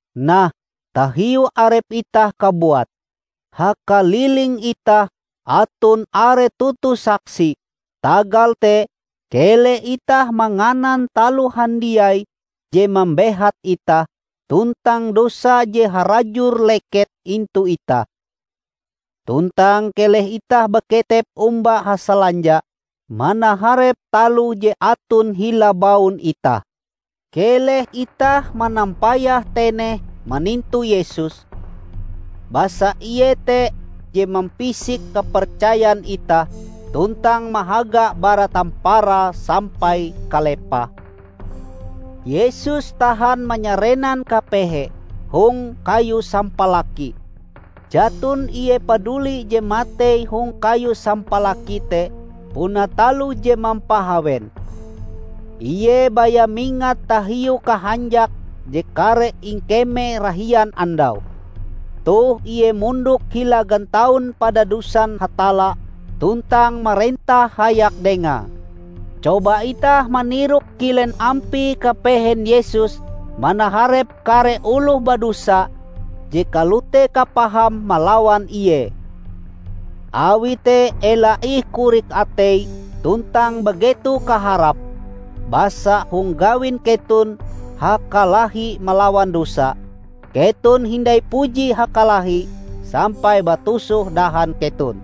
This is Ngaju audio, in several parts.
Nah, tahiu arep itah kabuat, hakaliling itah aton are toto saksi! Tagal te, keleh itah manganan taloh handiai je mambehat itah tuntang dosa je harajur leket intu itah. Tuntang keleh itah baketep omba hasalanja manaharep taloh je aton hila baun itah. Keleh itah manampayah teneh manintu Yesus, basa Ie te je mampisik kapercayan itah tuntang mahagae bara tamparae sampai kalepahe. Yesus tahan manyarenan kapehe hong kayu sampalaki! Jaton Ie paduli je matei hong kayu sampalaki te puna taloh je mampahawen. Ie baya mingat tahiu kahanjak je kareh ingkemee rahian andau. Toh Ie mondok hila gantaun padadusan Hatalla tuntang marentah hayak dengae. Coba itah maniroke kilen ampie kapehen Yesus manaharep kare oloh badosa je kalote kapahame malawan Ie! Awi te ela ih korik atei tuntang bageto kaharap. Basa hong gawin keton hakalahi malawan dosa, keton hindai puji hakalahi sampai batusoh dahan keton.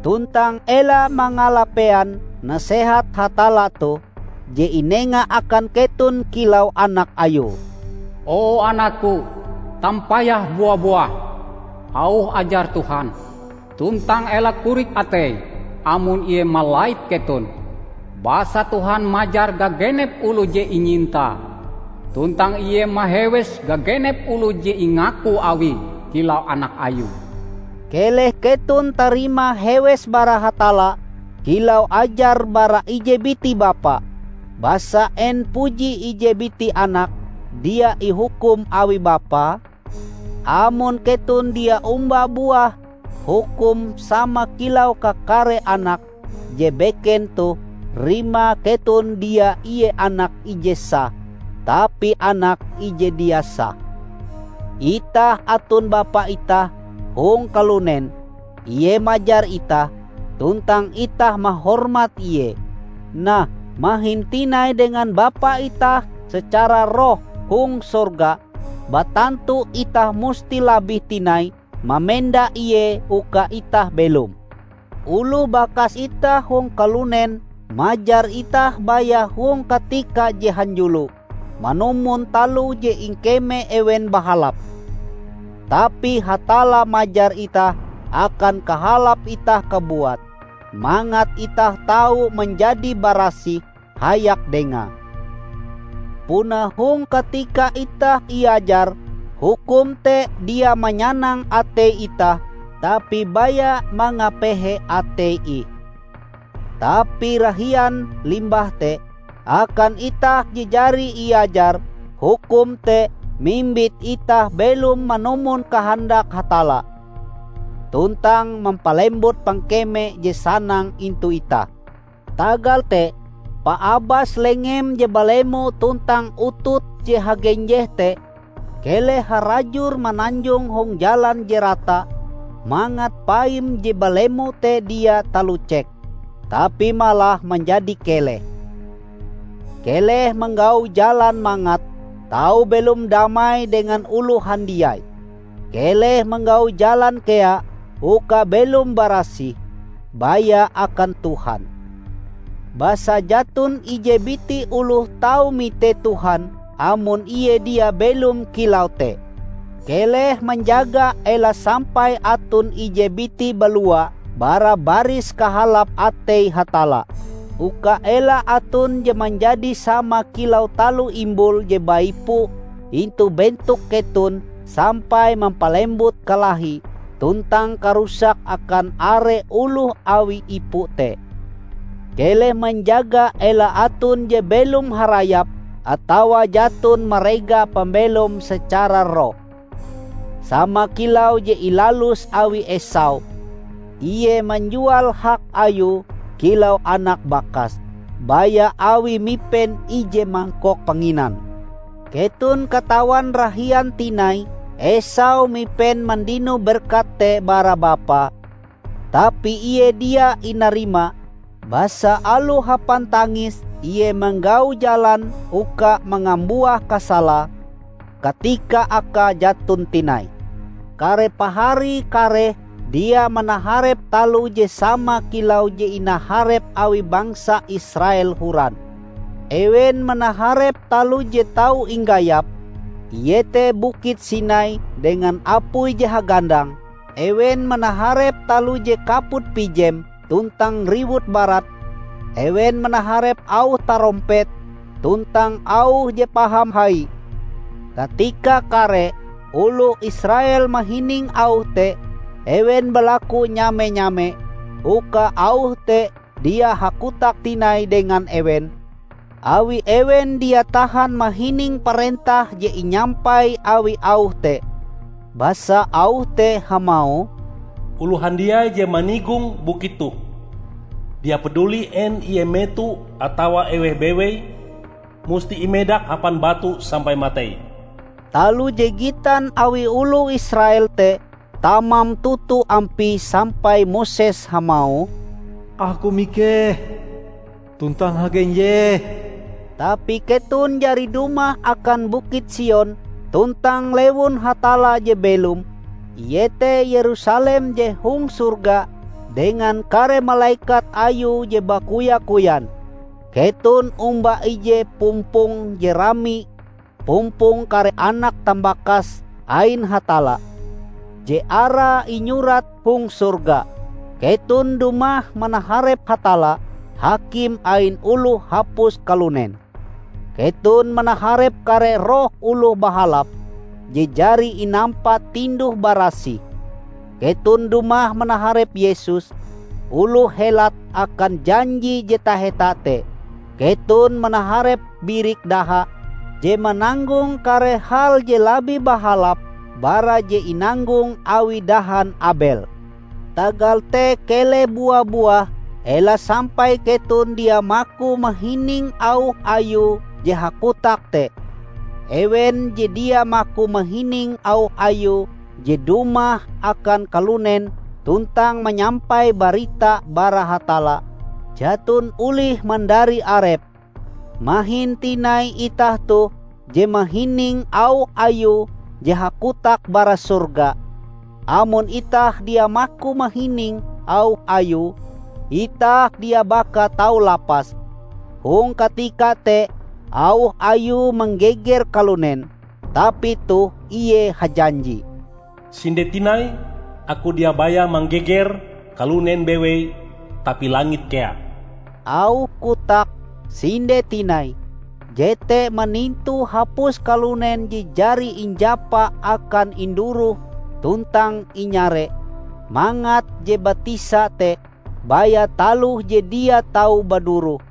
Tuntang ela mangalapean nasehat Hatalla toh, je inenga akan keton kilau anak Ayue: "O anak-Ku, tampayah bua-buah auh ajar Tuhan, tuntang ela korik atei amon Ie malait keton. Basa Tuhan majar gagenep oloh je inyintae, tuntang Ie mahewes gagenep oloh je ingaku Awie kilau anak Ayue." Keleh keton tarima hewes bara Hatalla kilau ajar bara ije biti bapa. Basa en puji ije biti anak dia ihukum awi bapae? Amon keton dia omba buah hukum sama kilau kakare anake je beken toh rimae keton dia ie anak ije sah, tapi anak ije dia sah. Itah aton bapa itah hong kalunen. Ie majar itah, tuntang itah mahormat ie. Nah, mahin tinai dengan Bapa itah secara roh hong sorga, batantu itah musti labih tinai mamenda Ie uka itah belom. Oloh bakas itah hong kalunen majar itah baya hong katika je hanjulo, manumon taloh je ingkeme ewen bahalap. Tapi Hatalla majar itah akan kahalap itah kabuat, mangat itah tau manjadi barasih hayak dengae. Punae hong katika itah iajar, hukum te dia manyanang atei itah, tapi baya mangapehe atei ih. Tapi rahian limbah te, akan itah je jari iajar, hukum te mimbit itah belom manumon kahandak Hatalla, tuntang mampalembut pangkeme je sanang intu itah. Tagal te, paabas lengem je balemo tuntang ututm je hagenjeh te! Keleh harajur mananjong hong jalan je rata, mangat paim je balemo te dia talucek, tapi malah manjadi keleh. Keleh manggau jalan mangat tau belom damai dengan oloh handiai. Keleh manggau jalan kea uka belom barasih, baya akan Tuhan. Basa jaton ije biti oloh tau mite Tuhan amon ie dia belom kilau te. Keleh manjaga ela sampai aton ije biti balua bara baris kahalap atei Hatalla, uka ela aton je manjadi sama kilau taloh imbul je baipu intu bentok keton sampai mampalembut kalahi tuntang karusak akan are oloh awi ipu te. Keleh manjaga ela aton je belom harayap atawa jaton marega pambelom secara roh, sama kilau je ilalus awi Esau. Ie manjual hak ayue kilau anak bakas, baya awi mipen ije mangkok panginan. Keton katawan rahian tinai Esau mipen mandino berkat te bara bapae, tapi ie dia inarima. Basa aloh hapan tangis ie manggau jalan uka mangambuah kasalae, katika akae jaton tinai. Kare pahari kareh dia manaharep taloh je sama kilau je inaharep awi bangsa Israel horan. Ewen manaharep taloh je tau inggayap, iete Bukit Sinai dengan apuie je hagandang; ewen manaharep taloh je kaput-pijem tuntang riwut barat; ewen manaharep auh tarompet, tuntang auh je paham hai. Katika kare oloh Israel mahining auh te, ewen balaku nyame-nyame uka auh te dia hakotak tinai dengan ewen. Awi ewen dia tahan mahining parentah je inyampai awi auh te. Basa auh te hamauh, "Oloh handiai je manigong bukit toh, dia paduli en ie meto atawa eweh bewei, musti imedak hapan batu sampai matei." Taloh je gitan awi oloh Israel te tamam toto ampie sampai Moses hamauh, "Aku mikeh tuntang hagenjeh!" Tapi keton jari dumah akan Bukit Sion tuntang lewun Hatalla je belom, iete Yerusalem je hong sorga dengan kare malekat Ayue je bakoya-koyan. Keton omba ije pumpong je rami -- pumpong kare anak tambakas ain Hatalla, je arae inyurat hong sorga. Keton dumah manaharep Hatalla, Hakim ain oloh hapus kalunen. Keton manaharep kare roh oloh bahalap, je jari inampa tinduh-barasih. Keton dumah manaharep Yesus, oloh helat akan janji je taheta te; keton manaharep birik daha je mananggong kare hal je labih bahalap bara je inanggong awi dahan Abel. Tagal te keleh bua-buah ela sampai keton dia maku mahining auh Ayue je hakotak te. Ewen je dia maku mahining auh Ayue je dumah akan kalunen tuntang manyampai barita bara Hatalla, jaton olih mandari arepe. Mahin tinai itah toh je mahining auh Ayue je hakotak bara sorga! Amon itah dia maku mahining auh Ayue, itah dia baka tau lapas! Hong katika te auh Ayue manggeger kalunen. Tapi toh ie hajanji, "Sinde tinai, Aku dia baya manggeger kalunen bewei tapi langit kea." Auh kotak "sinde tinai" jete manintu hapus kalunen je jari injapa akan induroh tuntang inyare, mangat je batisa te baya taloh je dia tau baduroh.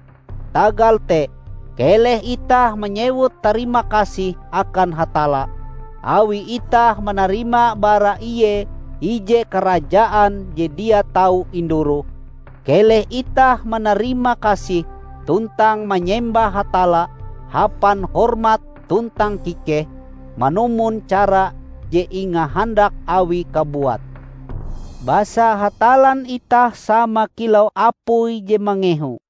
Tagal te, keleh itah manyewut tarimakasih akan Hatalla, awi itah manarima bara Ie ije karajaan je dia tau induroh. Keleh itah manarimakasih tuntang manyembah Hatalla hapan hormat tuntang kikeh, manumon cara je ingahandak Awie kabuat. Basa Hatallan itah sama kilau apui je mangehu.